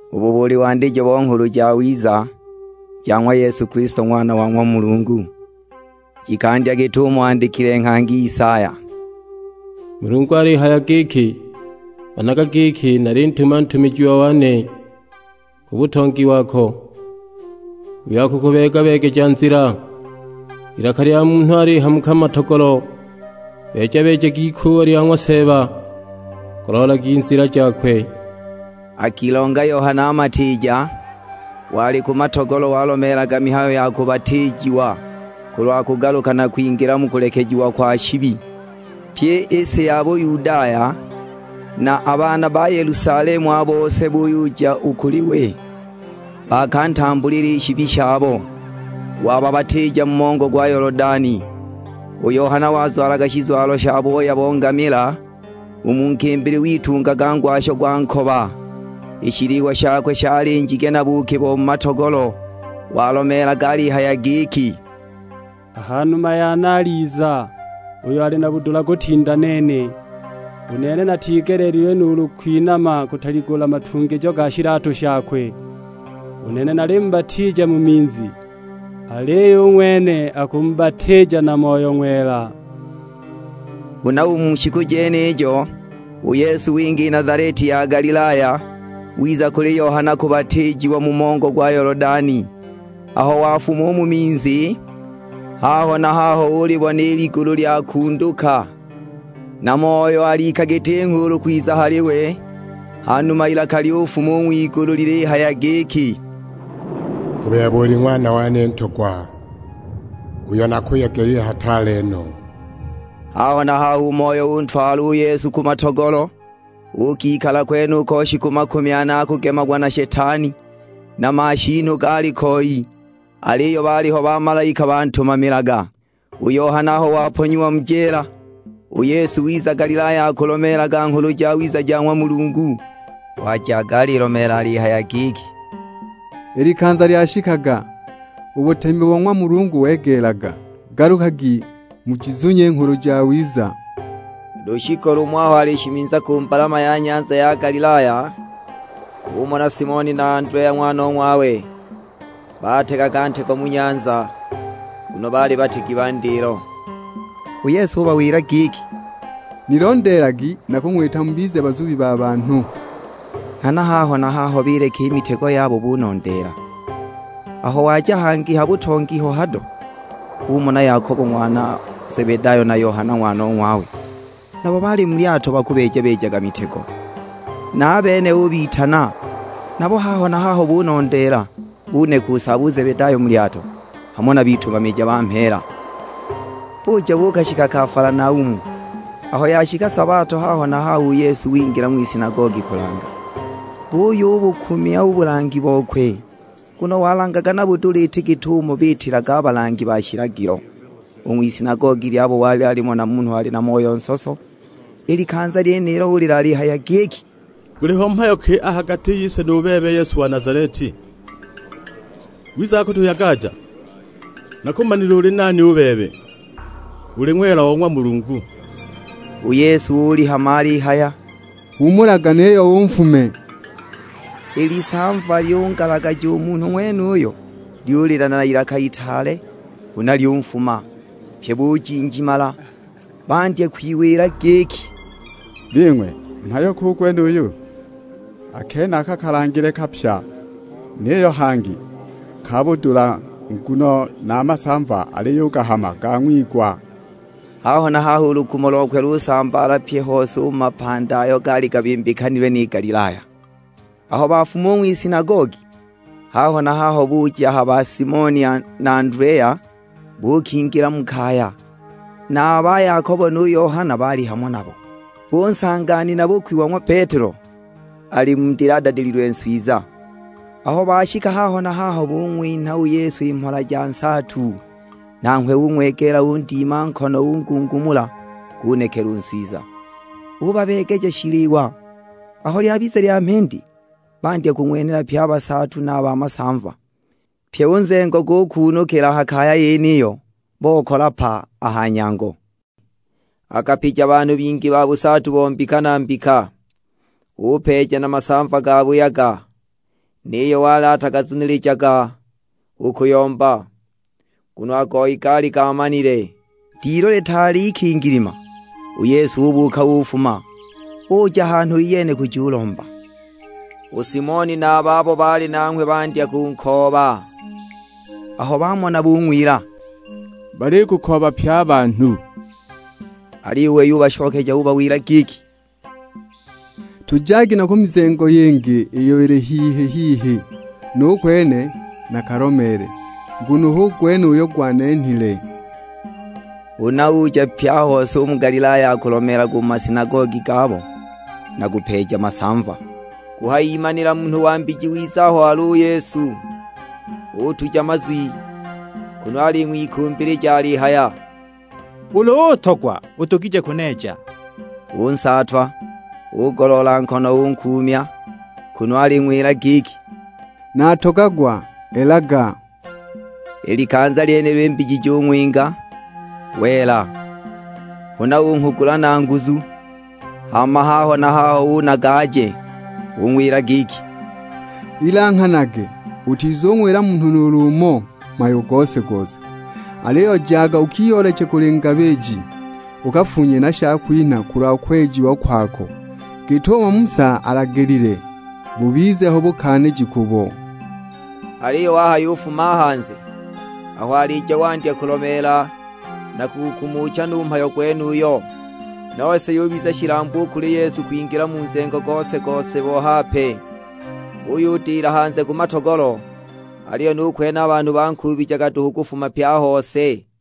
Ubu buli wandijo bo Nghulu Jawiza ja ng'wa Yesu Kilisto, Ng'wana wa ng'wa Mulungu. Jikandya git'umo andikile nghangi Isaya, "Mulungu alihaya giki, 'Managa giki, nalintuma ntumijiwa wane ku butongi wako, uyo akukubeeja-beegeja nzila.' Ilaka lya munhu alihamuka mu matogolo, 'Beeja-beejagi ikuuwa lya ng'wa Seeba, goloolagi nzila jakwe.' " Akilonga Yohana Matiija, wali ku matogolo walomeelaga mihayo ya bubatiijiwa kulwa kugaluka na kwingila mu kulekejiwa kwa shibi. Pyi i si ya Buyudaya, na a bana Yelusalemu a bose buyuja u kuli we, baakatambuula i shibi shabo, wababatiija mu mongo gwa Yolodani. U Yohana wazwalaga shizwalo sha booya bo ngamila, u mu nkimbili witungaga ngwasho gwa nkoba; i shiliwa shakwe shali njige na buuki bo mu matogolo. Walomeelaga alihaya giki, "A ha numa yane aliza uyo ali na budula kutinda nene, u nene natigeleelilwe nuulu kwinama kutaligula matungijo ga shilatu shakwe. U nene nalimubatiija mu minzi, aliyo u ng'wene akumubatiija na Moyo Ng'wela." Huna u mu shiku jenijo, u Yesu winga i Nazaleti ya Galilaya, wiza kuli Yohana kubatiijiwa mu mongo gwa Yolodani. Aho wafuma u mu minzi, haho na haho ulibona i ligulu lyakunduka, na Moyo alika giti nghuulu kwiza hali we. Ha numa ilaka lyufuma u ng'wigulu lilihaya giki, "U bebe uli Ng'wana wane Ntogwa, uyo nakuyegelile hataale no." Haho na haho u Moyo untwala u Yesu ku matogolo. Uukikala kwenuko shiku makumi ane akugemagwa na Shetani; na mashiinu gaalikoi. Aliyo baaliho bamalaika bantumamilaga. U Yohana aho waponyiwa mu jeela, u Yesu wiza Galilaya akulomeelaga Nghulu Jawiza ja ng'wa Mulungu. Wajaga alilomeela alihaya giki, "I likanza lyashikaga, u butemi bo ng'wa Mulungu wegeelaga, galukagi mujizunye i Nghulu Jawiza!" Lushiku lumo aho alishimiza ku mbalama ya nyanza ya Galilaya, umona Simoni na Andelea ng'wanong'wawe; bategaga ntego mu nyanza, nguno baali bategi ba ndilo. U Yesu ubawila giki, "Nilondeelagi, nakung'wita mubize bazubi ba banhu." Nghana haho na haho bileka i mitego yabo, bunondeela. Aho waja hangi ha butongi ho hado, umona Yakobo ng'wana Zebedayo na Yohana ng'wanong'wawe; nabo baali mu lyato bakubeeja-beejaga mitego. Na a bene ubitana; nabo haho na haho bunondeela, buneka u saabo u Zebedayo mu lyato, hamo na bitumamija ba mheela. Buja buukashika Kafalanaumu, aho yashika sabato haho na haho u Yesu wingila ng'wisinagogi kulanga. Buyubukumya u bulangi bokwe, nguno walangaga na budula, iti git'umo biitilaga a balangi ba shilagilo. U ng'wisinagogi lyabo walimo na munhu ali na moyo nsoso, i likanza lyenilo ulila alihaya giki, "Guliho mhayo ki a ha gati yise nu bebe Yesu wa Nazaleti? Wizaga kutuyagaja? Nakumanile uli nani u bebe, uli Ng'wela o ng'wa Mulungu!" U Yesu ulihama alihaya, "Huumulaga, niyo unfume!" I lisamva lyungalagaja u munhu ng'wenuyo, lyulila n'ilaka itaale, huna lyunfuma. Pye bujinjimala, bandya kwiwila giki, "Bing'we, mhayo ki u gwenuyu? A kenaka kalangile kapya, niyo hangi ka budula, nguno na a masamva aliyugahama gang'wigwa!" Haho na haho u lukumo lokwe lusambaala pye a hose u mu mapandi ayo gaali gabimbikanilwe ni Galilaya. Aho bafuma u ng'wisinagogi, haho na haho buja ha ba Simoni na Andelea, buukingila mu kaya; na a ba Yakobo nu Yohana baali hamo nabo. Bunsanga nina-bukwi wa ng'wa Petelo ali mu ndili adadililwe nswiza. Aho bashika haho na haho bung'winha u Yesu i mhola ja nsaatu. Nanghwe ung'wegeela undima nkono ungungumula, gunekela u nswiza, ubabeegeja shiliwa. Aho lyabiza lya mhindi, bandya kung'wenhela pye a basaatu, na a ba masamva. Pye u nzengo gukuunukila a ha kaya yeniyo, bokala pa a ha nyango. Akapija banhu bingi ba busaatu bo mbika na mbika, upeeja na masamva gabuyaga, niyo wali atagazunilijaga u kuyomba, nguno a goyi gaali gaamanile. Dilu litaali ikingilima, u Yesu ubuuka ufuma, uja hanhu iyene kujulomba. U Simoni na a babo baali nanghwe bandya kunkooba; aho bamona bung'wila, "Balikukooba pye a banhu." Aliyo u wei ubashokeja ubawila giki, "Tujagi na ku mizengo yingi iyo ili hihi-hihi, nu kwene nakalomeele. Nguno hu gwene uyo gwanenhile." Huna uja pye a hose u mu Galilaya akulomeelaga u mu masinagogi gabo, na kupeeja masamva. Kuhayimanila munhu wa mbiji wiza aho wali u Yesu, utuja mazwi kunu aling'wikumbilija alihaya, "Ulu utogwa udugije kuneeja." Unsaatwa, ugoloola nkono unkuumya; kunu aling'wila giki, "Natogagwa, elaga." I likanza lyenilo i mbiji jung'winga, wela. Huna unghugula na nguzu, hama haho na haho unaga aje. Ung'wila giki, "Ilanghanage, utizung'wila munhu nuulu umo mhayo gose-gose. Aliyo jaga ukiyooleche kuli ngabiji, ukafunye na shakwinha kulwa kwejiwa kwako, git'umo Musa alagilile, bubize ho bukaaniji kubo." Aliyo wahayufuma a hanze, aho alija wandya kulomeela na kugukumucha no u mhayo gwenuyo. Nose yubiza shilambu u kuli Yesu kwingila mu nzengo gose-gose bo hape. Uyudila hanze ku matogolo, aliyo nu kwene a banhu bankuubijaga duhu kufuma pye a hose.